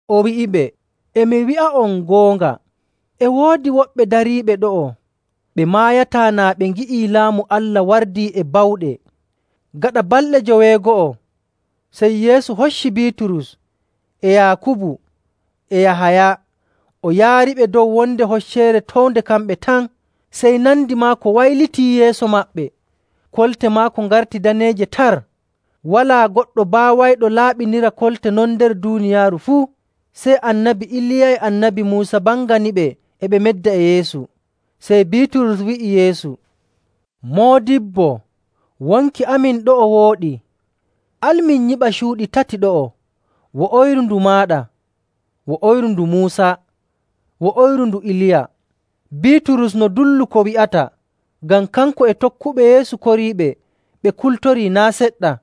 O wi'iɓe, “E mi wi'a'on goonga, e woodi woɓɓe dariiɓe ɗo'o ɓe maayataa naa ɓe ngi'ii Laamu Allah wardi e bawɗe.” Gaɗa balɗe joweego'o, sey Yeesu hocci Biiturus, e Yaakubu, e Yahaya, o yaariɓe dow wonde hocceere townde kamɓe tan. Sey nandi maako waylitii yeeso maɓɓe. Kolte maako ngarti daneeje tar. Walaa goɗɗo baawayɗo laaɓinira kolte non nder duuniyaaru fuu. Sey Annabi Iliya e Annabi Muusa mbanganiɓe e ɓe medda e Yeesu. Sey Biiturus wi'i Yeesu, “Moodibbo, wonki amin ɗo'o e wooɗi. Al min nyiɓa cuuɗi tati ɗo'o, wo'oyru ndu maaɗa, wo'oyru ndu Muusa, wo'oyru ndu Iliya.” Biiturus no dullu ko wi'ata ngam kanko e tokkuɓe Yeesu koriiɓe ɓe kultorii naa' seɗɗa.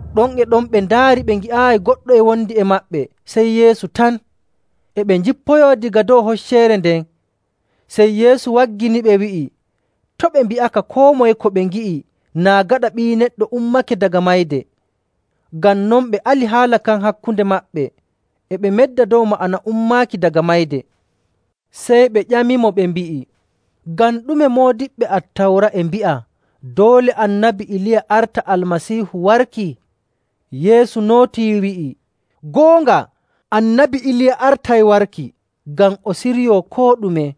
Ɗon e ɗon ɓe ndaari ɓe ngi'aayi goɗɗo e wondi e maɓɓe sey Yeesu tan. E ɓe njippoyoo daga dow hocceere nden, sey Yeesu wagginiɓe wi'i to' ɓe mbi'a koo moye ko ɓe ngi'i naa gaɗa Ɓii Neɗɗo ummake daga mayde. Ngam non ɓe ali haala kan hakkunde maɓɓe, e ɓe medda dow ma'ana “ummaaki daga mayde.” Sey ɓe ƴamimo, ɓe mbi'i, “Ngam ɗume moodiɓɓe Attawra e mbi'a doole Annabi Iliya arta Almasiihu warki?”. Yeesu nootii, wi'i, “Goonga, Annabi Iliya artay warki ngam o siryoo koo ɗume.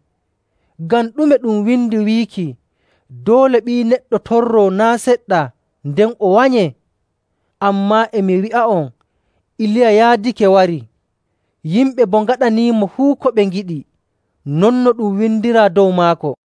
Ngam ɗume ɗum windi wiiki doole Ɓii Neɗɗo torroo naa' seɗɗa nden o wanyee? Ammaa e mi wi'a'on Iliya yaadake warii, yimɓe boo ngaɗaniimo fuu ko ɓe ngiɗi, non no ɗum windiraa dow maako.”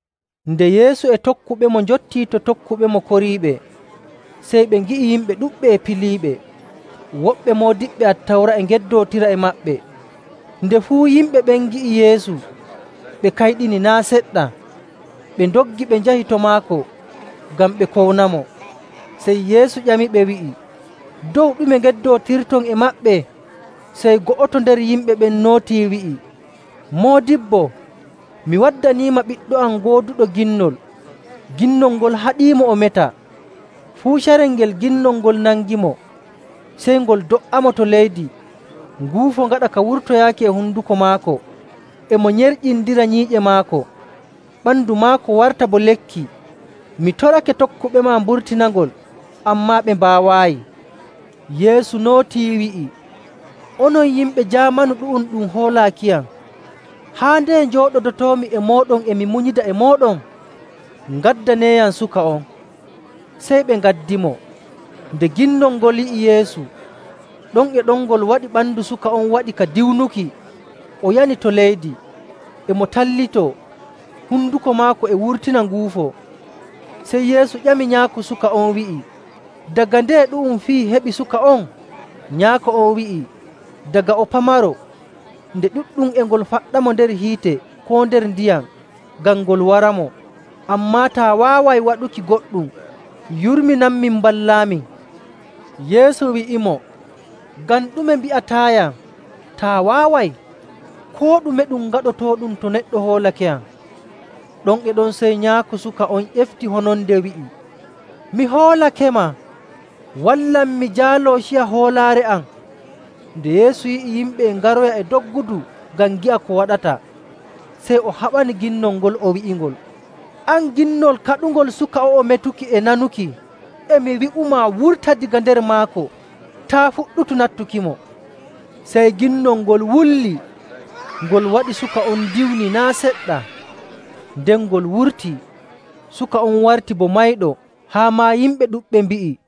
Nde Yeesu e tokkuɓemo njottii to tokkuɓemo koriiɓe, sey ɓe ngi'i yimɓe ɗuɗɓe e piliiɓe. Woɓɓe moodiɓɓe Attawra e ngeddootira e maɓɓe. Nde fuu yimɓe ɓen ngi'i Yeesu, ɓe kayɗini naa' seɗɗa, ɓe ndoggi ɓe njahi to maako ngam ɓe kownamo. Sey Yeesu ƴamiɓe wi'i, “Dow ɗume ngeddootirton e maɓɓe?” Sey go'oto nder yimɓe ɓen nootii wi'i, “Moodibbo, mi waddaniima ɓiɗɗo am gooduɗo ginnol. Ginnol ngol haɗiimo o meta. Fuu carel ngel ginnol ngol nangimo, sey ngol do''amo to leydi, nguufo ngaɗa ka wurtaaki e honduko maako, e mo nyerƴindira nyiiƴe maako, ɓandu maako warta bo lekki. Mi torake tokkuɓema mburtinangol, ammaa ɓe mbaawaayi.” Yeesu nootii wi'i, “Onon yimɓe jaamanu ɗu'um ɗum hoolaakiyam, haa ndeye njooɗodotoomi e mooɗon e mi munyida e mooɗon? Ngaddaneeyam suka on.” Sey ɓe ngaddimo. Nde ginnol ngol yi'i Yeesu, ɗon e ɗon ngol waɗi ɓandu suka on waɗi ka diwnuki, o yani to leydi, e mo tallitoo, honduko maako e wurtina nguufo. Sey Yeesu ƴami nyaako suka on, wi'i, “Daga ndeye ɗu'um fii heɓi suka on?” Nyaako on wi'i, “Daga o pamaro. Nde ɗuɗɗum e ngol faɗɗamo nder hiite koo nder ndiyam ngam ngol waramo. Ammaa taa waaway waɗuki goɗɗum, yurminanmin mballaamin.” Yeesu wi'imo, “Ngam ɗume mbi'ataayam, ‘taa waaway?’ Koo ɗume ɗum gaɗotooɗum to neɗɗo hoolakeyam.” Ɗon e ɗon sey nyaako suka on ƴefti hononde wi'i, “Mi hoolakema. Wallam mi jaaloo ciya hoolaare am!” Nde Yeesu yi'i yimɓe e ngaroya e doggudu ngam ngi'a ko waɗata, sey o haɓani ginnol ngol, o wi'ingol, “An, ginnol kaɗungol suka o'o metuki e nanuki, e mi wi'imaa, wurta daga nder maako! Taa' fuɗɗutu nattukimo!” Sey ginnol ngol wulli, ngol waɗi suka on diwni naa' seɗɗa, nden ngol wurtii. Suka on warti bo mayɗo, haa maa yimɓe ɗuɗɓe mbi'i,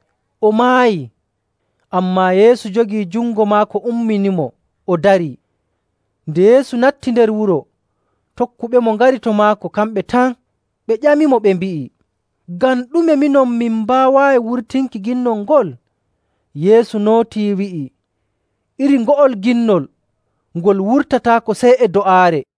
“O maayii.” Ammaa Yeesu jogii jungo maako umminimo, o darii. Nde Yeesu natti nder wuro, tokkuɓemo ngari to maako kamɓe tan, ɓe ƴamimo ɓe mbi'i, “Ngam ɗume minon min mbaawaayi wurtinki ginnol ngol?” Yeesu nootii, wi'i, “Iri ngo'ol ginnol ngol wurtataako sey e do'aare.”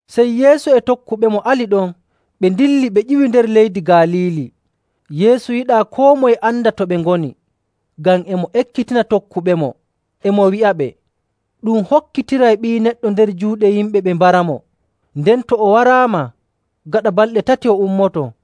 Sey Yeesu e tokkuɓemo ali ɗon ɓe ndilli ɓe ƴiwi nder leydi Galiili. Yeesu yiɗaa koo moye anda to ɓe ngoni, ngam e mo ekkitina tokkuɓemo, e mo wi'aɓe, “Ɗum hokkitiray Ɓii Neɗɗo nder juuɗe yimɓe ɓe mbaramo. Nden to o waraama, gaɗa balɗe tati o ummoto.”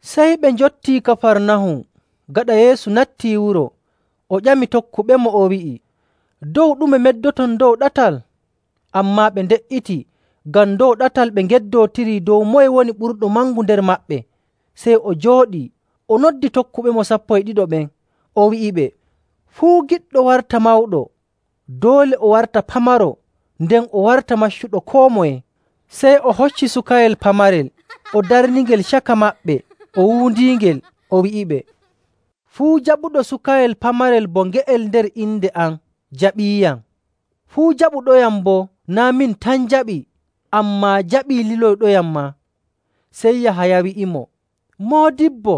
Sey ɓe njottii Kafarnahum. Gaɗa Yeesu nattii wuro, o ƴami tokkuɓemo, o wi'i, “Dow ɗume meddoton dow ɗatal?” Ammaa ɓe nde''iti ngam dow ɗatal ɓe ngeddootiri dow moye woni ɓurɗo mangu nder maɓɓe.. Sey o jooɗii, o noddi tokkuɓemo sappo e ɗiɗo ɓen, o wi'iɓe, “Fuu giɗɗo warta mawɗo, doole o warta pamaro, nden o warta maccuɗo koo moye.”. Sey o hocci suka pamaro, o darningel caka maɓɓe, o wuundiingel, o wi'iɓe, “Fuu jaɓuɗo sukayel pamarel bo nge'el nder inde am jaɓiiyam. Fuu jaɓuɗoyam boo naa' min tan jaɓi, ammaa jaɓii liloyɗoyam maa.”. Sey Yahaya wi'imo, “Moodibbo,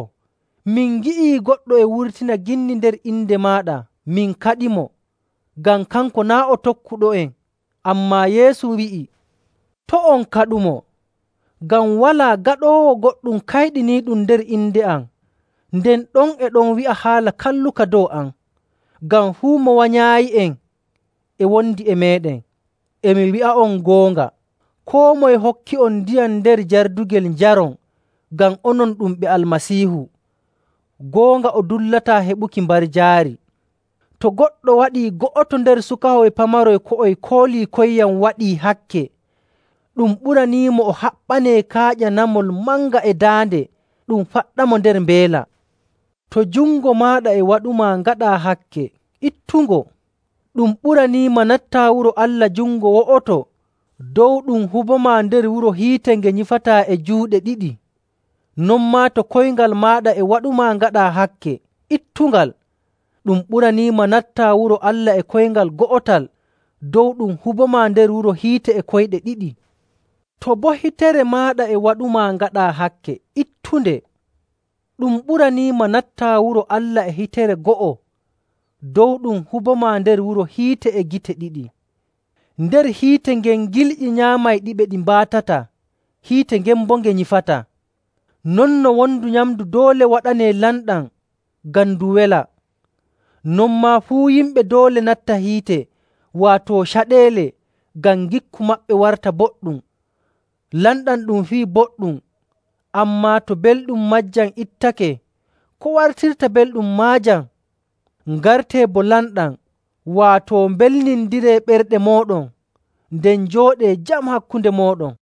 min ngi'i goɗɗo e wurtina ginni nder inde maaɗa min kaɗimo, ngam kanko naa' o tokkuɗo'en.” Ammaa Yeesu wi'i, “To' on kaɗumo, ngam walaa gaɗoowo goɗɗum kayɗiniiɗum nder inde am nden ɗon e ɗon wi'a haala kalluka dow am. Ngam fuu mo wanyaayi'en e wondi e meeɗen.. E mi wi'a'on goonga, koo moye hokki'on ndiyam nder jardugel njaron ngam onon ɗum ɓe Almasiihu, goonga o dullataa heɓuki mbarjaari.. “To goɗɗo waɗii go'oto nder sukahoy pamaroy ko'oy kooliikoyyam waɗii hakke, ɗum ɓuraniimo o haɓɓanee kaaƴa namol manga e daande ɗum faɗɗamo nder mbeela. To jungo maaɗa e waɗumaa ngaɗaa hakke, ittungo. Ɗum ɓuraniima nattaa wuro Allah jungo wo'oto dow ɗum hubomaa nder wuro hiite nge nyifataa e juuɗe ɗiɗi.. Non maa to koyngal maaɗa e waɗumaa ngaɗaa hakke, ittungal. Ɗum ɓuraniima nattaa wuro Allah e koyngal go'otal dow ɗum hubomaa nder wuro hiite e koyɗe ɗiɗi. To boo hitere maaɗa e waɗumaa ngaɗaa hakke, ittunde. Ɗum ɓuraniima nattaa wuro Allah e hitere go'o dow ɗum hubomaa nder wuro hiite e gite ɗiɗi.. Nder hiite ngen ‘gilƴi nyaamayɗiɓe ɗi mbaatataa, hiite ngen boo nge nyifataa.’. “Non no wondu nyamndu doole waɗanee lamɗam ngam ndu wela, non maa fuu yimɓe doole natta hiite, waato caɗeele, ngam ngikku maɓɓe warta boɗɗum. “Lamɗam ɗum fii boɗɗum, ammaa to belɗum maajam ittake, ko wartirta belɗum maajam? Ngartee bo lamɗam, waato mbelnindiree ɓerɗe mooɗon, nden njooɗee jam hakkunde mooɗon.”.